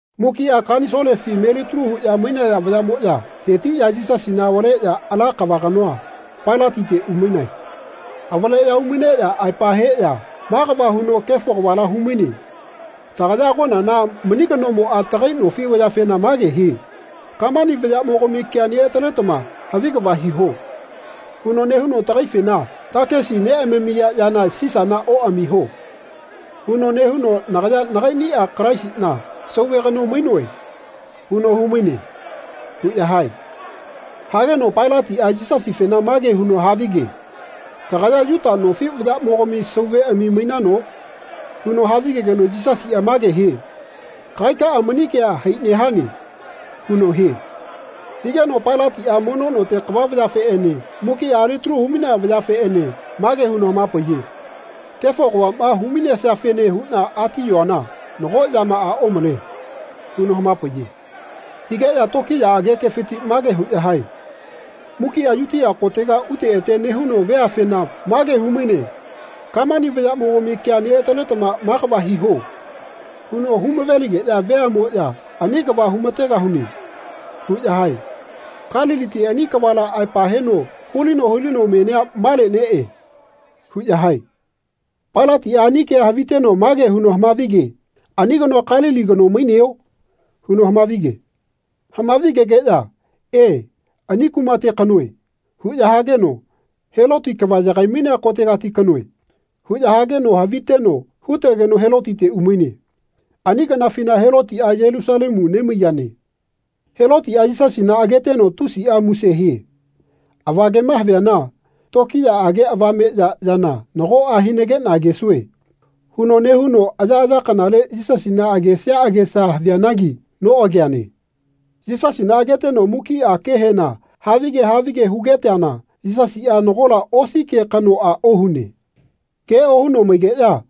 Mukiꞌa kanisolefi metalu huꞌya mainaya vayaꞌmoꞌya hetiꞌya Yisasina avaleꞌya ala kava kanoa, Pailatite umainae. Avaleꞌya umaineꞌya aepa heꞌya “Ma kava huno kefo kavala humaine. Tagaya agonana mani kanomoꞌa tagai nofi vayafena mage hie ‘Kamani vayaꞌmogami kea neꞌataletama havi kava hiho.’ huno nehuno tagaifena ‘Takisi neꞌamamiya yana Sisana oꞌamiho.’ huno nehuno ‘Nagaya nagaiꞌniꞌa Kalaisiꞌna, Sauve kano mainoe.’ huno humaine.” huꞌya hae. Hageno Pailatiꞌa Yisasifena mage huno havige “Kagaya Yuta nofi vayaꞌmogami Sauveꞌami mainano?” huno havigegeno Yisasiꞌa mage hie “Kagaikaꞌa mani kea hai nehane.” huno hie. Higeno Pailatiꞌa mono note kava vayafeꞌene mukiꞌa alitalu huꞌya mainaya vayafeꞌene mage huno hamapaiye “Kefo kavaꞌma hu-mainesiafene huꞌna atiyoana nago yamaꞌa omale.” huno hamapaiye. Higeꞌya tokiyaꞌage kefiti mage huꞌya hae “Mukiꞌa Yutia kotega ute ete nehuno veafena mage humaine ‘Kamani vayaꞌmogami kea neꞌataletama ma kava hiho.’ huno humaveligeꞌya veaꞌmoꞌya ‘Ani kava humategahune.’ huꞌya hae. Kaliliti ani kavala aepa heno hulino hulino menia male neꞌe.” huꞌya hae. Pailatiꞌa ani kea haviteno mage huno hamavige “Ani kanoa Kalili kano maineo?” huno hamavige. Hamavigegeꞌya “E, ani kumateti kanoe.” huꞌya hageno “Heloti kava yagaimainea kotegati kanoe.” huꞌya hageno haviteno hutegeno Helotite umaine. Ani kanafina Helotiꞌa Yelusalemu nemaiyane. Helotiꞌa Yisasina ageteno tusiꞌa muse hie. Avagema haviana “Tokiyaꞌage avameꞌya yana nagoꞌa hinageꞌna agesue.” huno nehuno ayaꞌaya kanale Yisasina agesia agesa havianagi noꞌageane. Yisasina ageteno mukiꞌa kehena havige havige hugeteana Yisasiꞌa nagola osi ke kanoꞌa ohune. Ke ohuno maigeꞌya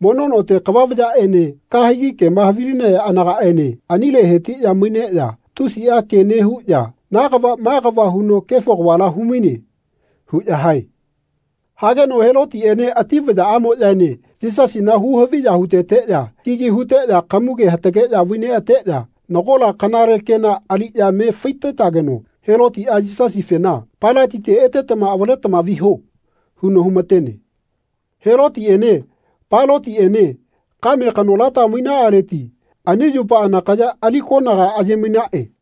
mono note kava vayaꞌene kahegi kema havilinaya anagaꞌene anile hetiꞌya maineꞌya tusiꞌa ke nehuꞌya “Na kava ma kava huno kefo kavala humaine.” huꞌya hae. Hageno Helotiꞌene ati vayaꞌamoꞌyaene Yisasina huhaviya huteteꞌya kigi huteꞌya kamuge hatageꞌya vaineꞌateꞌya nagola kanale kena aliꞌya me faitetageno Helotiꞌa Yisasifena “Pailatite etetama avaletama viho.” huno humatene. Helotiꞌene Pailatiꞌene kame kanolata mainaꞌaleti ani yupa anakaya ali konaga ayemainaꞌe.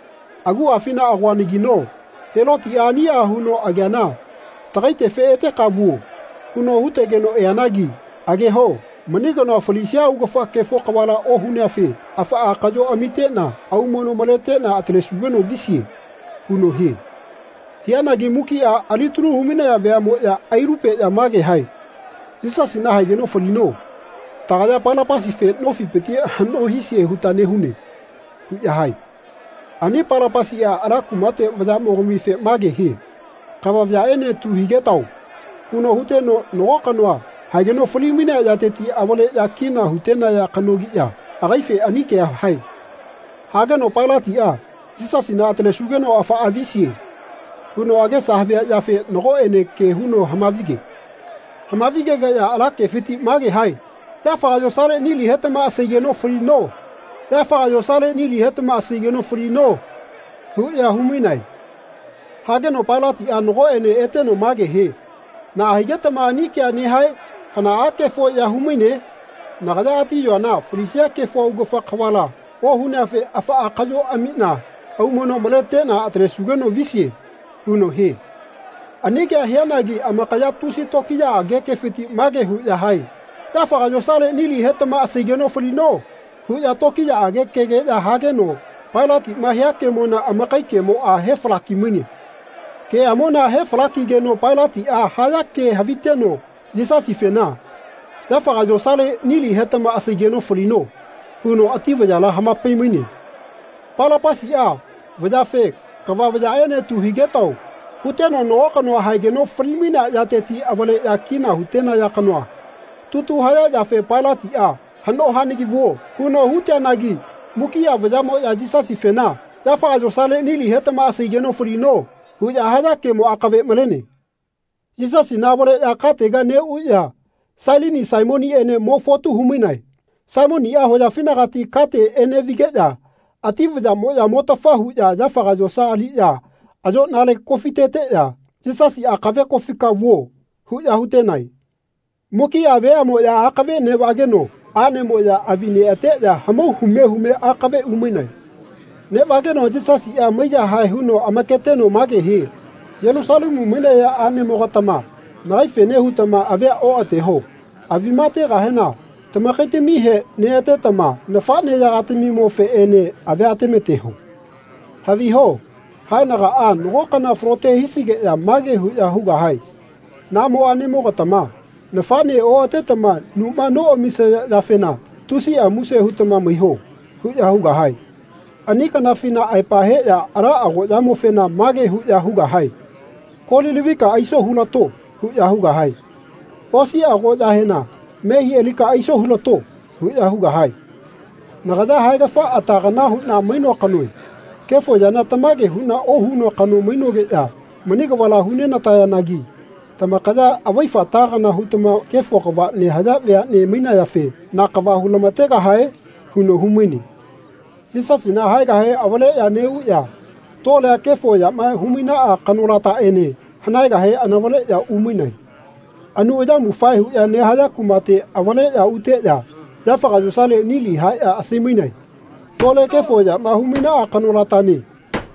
Aguꞌafina agoanagino Helotiꞌa aniꞌa huno ageana tagaitefe ‘Eteka vuo.’ huno hutegeno eanagi ageho mani kanoa falisia augafa kefo kavala ohuneafe afaꞌa kaꞌyo amiꞌna aumono maleteꞌna atalesugeno visie.” huno hie. Hianagi mukiꞌa alitalu humainaya veaꞌmoꞌya ailulupeꞌya mage hae “Yisasina haegeno falino. Tagaya Palapasife nofipiti haꞌno hisie huta nehune.” huꞌya hae. Ani Palapasiꞌa ala kumate vayaꞌyagamofe mage hie “Kava vayaꞌene tu higetao.” huno huteno nago kanoa haegeno falimainea yateti avaleꞌya kina hutenaya kanogiꞌya agaife ani kea hae. Hageno Pailatiꞌa “Yisasina atalesugeno afaꞌa visie.” huno agesa havia yafe nagoꞌene ke huno hamavige. Hamavigegeꞌya ala kefiti mage hae “Yafaga yosale nili hetama asaigeno falino. Yafaga yosale nili hetama asaigeno falino.” huꞌya humainae. Hageno Pailatiꞌa nagoꞌene eteno mage hie “Naꞌa higetama ani kea nehae? Hanaꞌa kefo ya humaine? Nagaya atiyoana falisia kefo augafa kavala ohuneafe afaꞌa kaꞌyo amiꞌna aumono maleteꞌna atalesugeno visie.” huno hie. Ani kea hianagi amakaya tusi tokiyaꞌage kefiti mage huꞌya hae “Yafaga yosale nili hetama asaigeno falino.” huꞌya tokiyaꞌage kegeꞌya hageno Pailatiꞌma hia kemona amakai kemoꞌa hefalaki-maine. Keꞌamona hefalakigeno Pailatiꞌa haya ke haviteno Yisasifena “Yafaga yosale nili hetama asaigeno falino.” huno ati vayala hamapaimaine. Palapasiꞌa vayafe “Kava vayaꞌene tu higetao.” huteno nago kanoa haegeno falimainea yateti avaleꞌya kina hutenaya kanoa tutu haya yafe Pailatiꞌa “Haꞌno hanagi vuo.” huno huteanagi mukiꞌa vayaꞌmoꞌya Yisasifena “Yafaga yosale nili hetama asaigeno falino.” huꞌya haya kemo akave malene. Yisasina avaleꞌya katega neꞌuꞌya Sailini Saimoniꞌene mo fotu humainae. Saimoniꞌa hoyafinagati kate eneꞌvigeꞌya ati vayaꞌmoꞌya motafa huꞌya yafaga yosa aliꞌya ayoꞌnale kofiteteꞌya “Yisasi akave kofika vuo.” huꞌya hutenae. Mukiꞌa veaꞌmoꞌya akave neꞌvageno aꞌnemoꞌya avi neꞌateꞌya hamau hume hume akave umainae. Neꞌvageno Yisasiꞌa maiyahae huno amaketeno mage hie “Yelusalemu mainaya aꞌnemogatama nagaifene hutama avia oꞌateho. Avima ategahena tamakaitamihe neꞌatetama nafaꞌneyagatamimofeꞌene avia atemateho. Haviho haenagaꞌa nago kana falote hisigeꞌya mage huꞌya hugahae ‘Namo aꞌnemogatama nafaꞌne oꞌatetama numa noꞌamisaya yafena tusiꞌa muse hutama maiho.’ huꞌya hugahae. Ani kanafina aepa heꞌya ala agoꞌyamofena mage huꞌya hugahae ‘Kolilavika aiso hulato.’ huꞌya hugahae. Osi agoꞌyahena ‘Mehi alika aiso hulato.’ huꞌya hugahae. Nagaya haegafa ata kana huꞌna mainoa kanoe. Kefo yana tamage huꞌna ohunoa kano mainogeꞌya mani kavala hunenatayanagi tamakaya avaifa ata kana hutama kefo kava nehaya veaꞌne mainayafe na kava hulamategahae?” huno humaine. Yisasina haegahe avaleꞌya neꞌuꞌya tolea kefo yama humainaꞌa kanolataꞌene hanaegahe anavaleꞌya umainae. Anu ayamufae huꞌya nehaya kumate avaleꞌya uteꞌya yafaga yosale nili haeꞌya asaimainae. Tole kefo yama humainaꞌa kanolatane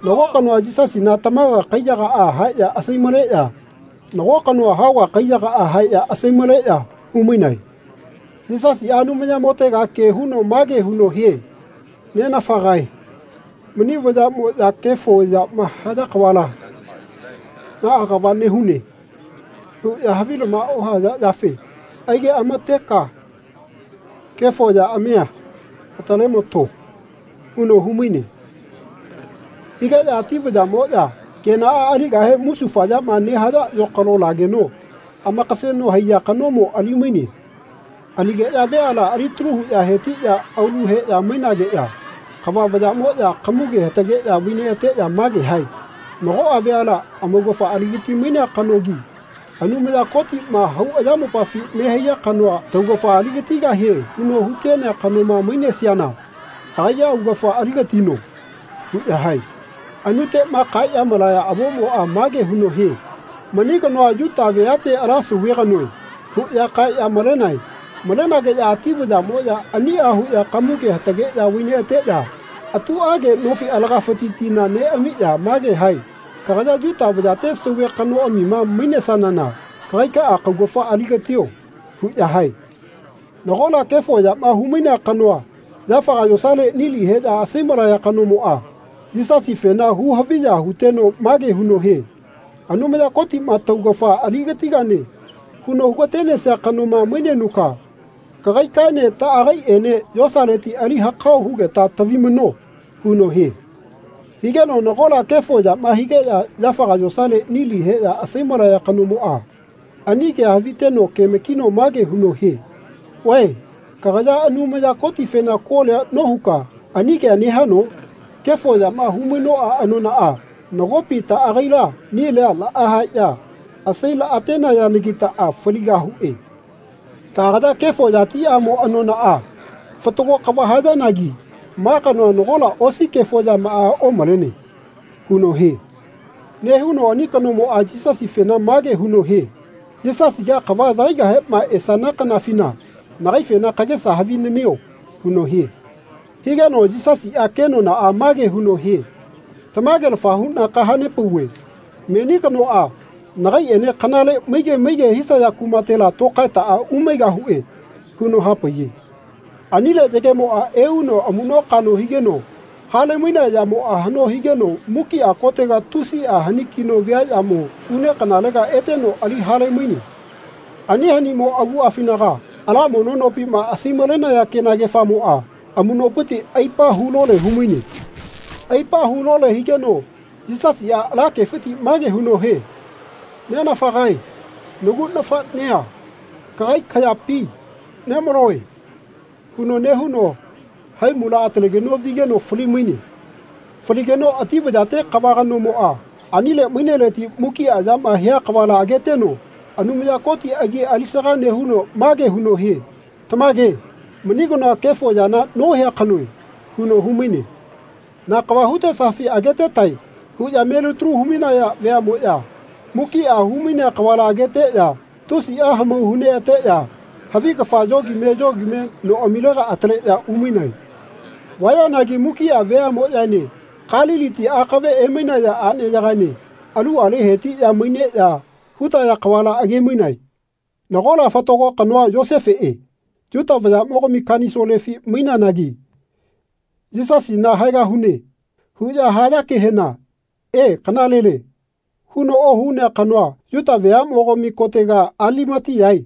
nago kanoa Yisasina tamaga kaiyagaꞌa haeꞌya asaimaleꞌya nago kanoa haoga kaiyagaꞌa haeꞌya asaimaleꞌya humainae. Yisasiꞌa Anumayamotega ke huno mage huno hie “Nenafagae mani vayaꞌmoꞌya kefo yama haya kavala ‘Naꞌa kava nehune.’ huꞌya havilama ohaya yafe aigeꞌamateka kefo yaꞌamia atalemato.” huno humaine. Higeꞌya ati vayaꞌmoꞌya kenaꞌa aligahe musufayama nehaya yokalo lageno amakaseno haiya kanomo alimaine. Aligeꞌya veala alitalu huꞌya hetiꞌya aulu heꞌya mainageꞌya kava vayaꞌmoꞌya kamuge hatageꞌya vaineꞌateꞌya mage hae “Nagoꞌa veala amaugafa aligatimainea kanogi Anumaya Kotiꞌma hau ayamopafi nehaiya kanoa taugafa aligatigahie huno hutenea kanoma mainesiana agaiꞌa augafa aligatino.” huꞌya hae. Anuteꞌma kaeꞌya malaya avomoꞌa mage huno hie “Mani kanoa Yuta veate ala Sauve kanoe.” huꞌya kaeꞌya malenae. Malenageꞌya ati vayaꞌmoꞌya aniꞌa huꞌya kamuge hatageꞌya vaineꞌateꞌya atuꞌage nofi alagafiti tina neꞌamiꞌya mage hae “Kagaya Yuta vayate sauve kanoꞌamima mainesanana kagaikaꞌa kaugafa aligatio.” huꞌya hae. Nagola kefo yama humainea kanoa yafaga yosale nili heꞌya asaimalaya kanomoꞌa Yisasifena hu-haviya huteno mage huno hie “Anumaya Kotiꞌma taugafa aligatigane huno hugatenesia kanoma mainenuka kagaikaene taꞌagaiꞌene yosaleti ali hakao hugeta tavimano.” huno hie. Higeno nagola kefo yama higeꞌya yafaga yosale nili heꞌya asaimalaya kanomoꞌa ani kea haviteno kemakino mage huno hie “Vae kagaya Anumaya Kotifena kolia nohuka ani kea nehano? Kefo yama humainoꞌa anonaꞌa nagopi taꞌagaila nilia laꞌahaeꞌya asailaꞌa-tenayanagitaꞌa faligahuꞌe. Taꞌagaya kefo yatiꞌamo anonaꞌa fatago kava hayanagi ma kanoa nagola osi kefo yamaꞌa omalene.” huno hie. Nehuno ani kanomoꞌa Yisasifena mage huno hie “Yisasiga kava yagaigahema esana kanafina nagaifena kagesa havi namio.” huno hie. Higeno Yisasiꞌa kenonaꞌa mage huno hie “Tamagelafa huꞌna kahanepauve meni kanoꞌa nagaiꞌene kanale maige maige hisaya kumatela tokaetaꞌa umaigahuꞌe.” huno hapaiye. Anile yagemoꞌa euno amuꞌnokaꞌno higeno halemainea yamoꞌa haꞌno higeno mukiꞌa kotega tusiꞌa hanikino viaꞌyamo une kanalega eteno ali halemaine. Ani hanimo aguꞌafinaga ala mono nopima asaimalenaya kenagefamoꞌa amuꞌnopiti aipa hulole humaine. Aipa hulole higeno Yisasiꞌa ala kefiti mage huno hie “Nenafagae nagu nafaꞌnea kagai kayapi nemaloe” huno nehuno haimula atalegeno vigeno falimaine. Faligeno ati vayate kava kanomoꞌa anile maineleti mukiꞌa yama hia kavala ageteno Anumaya Koti agi alisaga nehuno mage huno hie “Tamage mani kanoa kefo yana nohia kanoe.” huno humaine. “Na kava hutesafi agetetae.” huꞌya melitalu humainaya veaꞌmoꞌya mukiꞌa humainea kavala ageteꞌya tusiꞌa hamau huneꞌateꞌya havi kafa yogime yogime noꞌamilega ataleꞌya umainae. Vayanagi mukiꞌa veaꞌmoꞌyaene Kaliliti akave emainaya aꞌneyagaene aluꞌale hetiꞌya maineꞌya hutaya kavala agemainae. Nagola fatago kanoa Yosefeꞌe, Yuta vayaꞌmogami Kanisolefi maineanagi “Yisasina haegahune.” huꞌya haya kehena “E, kanalele.” huno ohunea kanoa Yuta veaꞌmogami kotega Alimatiyae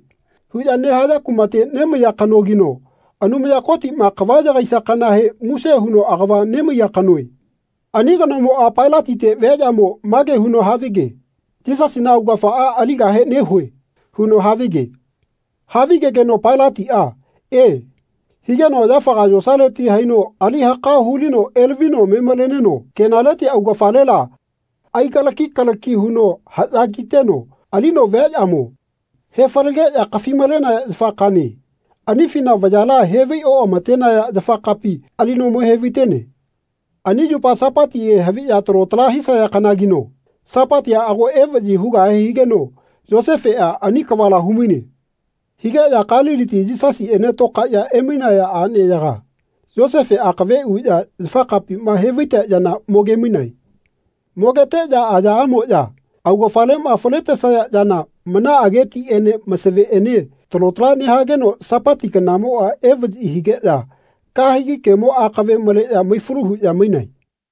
huꞌya nehaya kumate nemaiya kanogino Anumaya Kotiꞌma kava yagaisia kanahe muse huno agava nemaiya kanoe. Ani kanomoꞌa Pailatite viaꞌyamo mage huno havige “Yisasina augafaꞌa aligahe nehue.” huno havige. Havigegeno Pailatiꞌa “E” higeno yafaga yosaleti haino ali hakao hulino elavino memaleneno kenaleti augafalela aigalaki kalaki huno haꞌya kiteno alino viaꞌyamo he falageꞌya kafimalenaya yafa kane, anifina vayala hevai oꞌamatenaya yafakapima alino mo hevaitene. Ani yupa Sapatihe haviꞌya talo tala hisaya kanagino Sapatia ago evaꞌyi hugahe higeno Yosefeꞌa ani kavala humaine. Higeꞌya Kaliliti Yisasiꞌene tokaeꞌya emainaya aꞌneyaga Yosefe akave uꞌya yafakapima hevaitea yana mogemainae. Mogeteꞌya ayaꞌamoꞌya augafaleꞌma faletesaya yana manaꞌage tiꞌene masaveꞌene talo tala nehageno Sapati kanamoꞌa evaꞌyi higeꞌya kahegi kemo akave maleꞌya maifalu huꞌya mainae.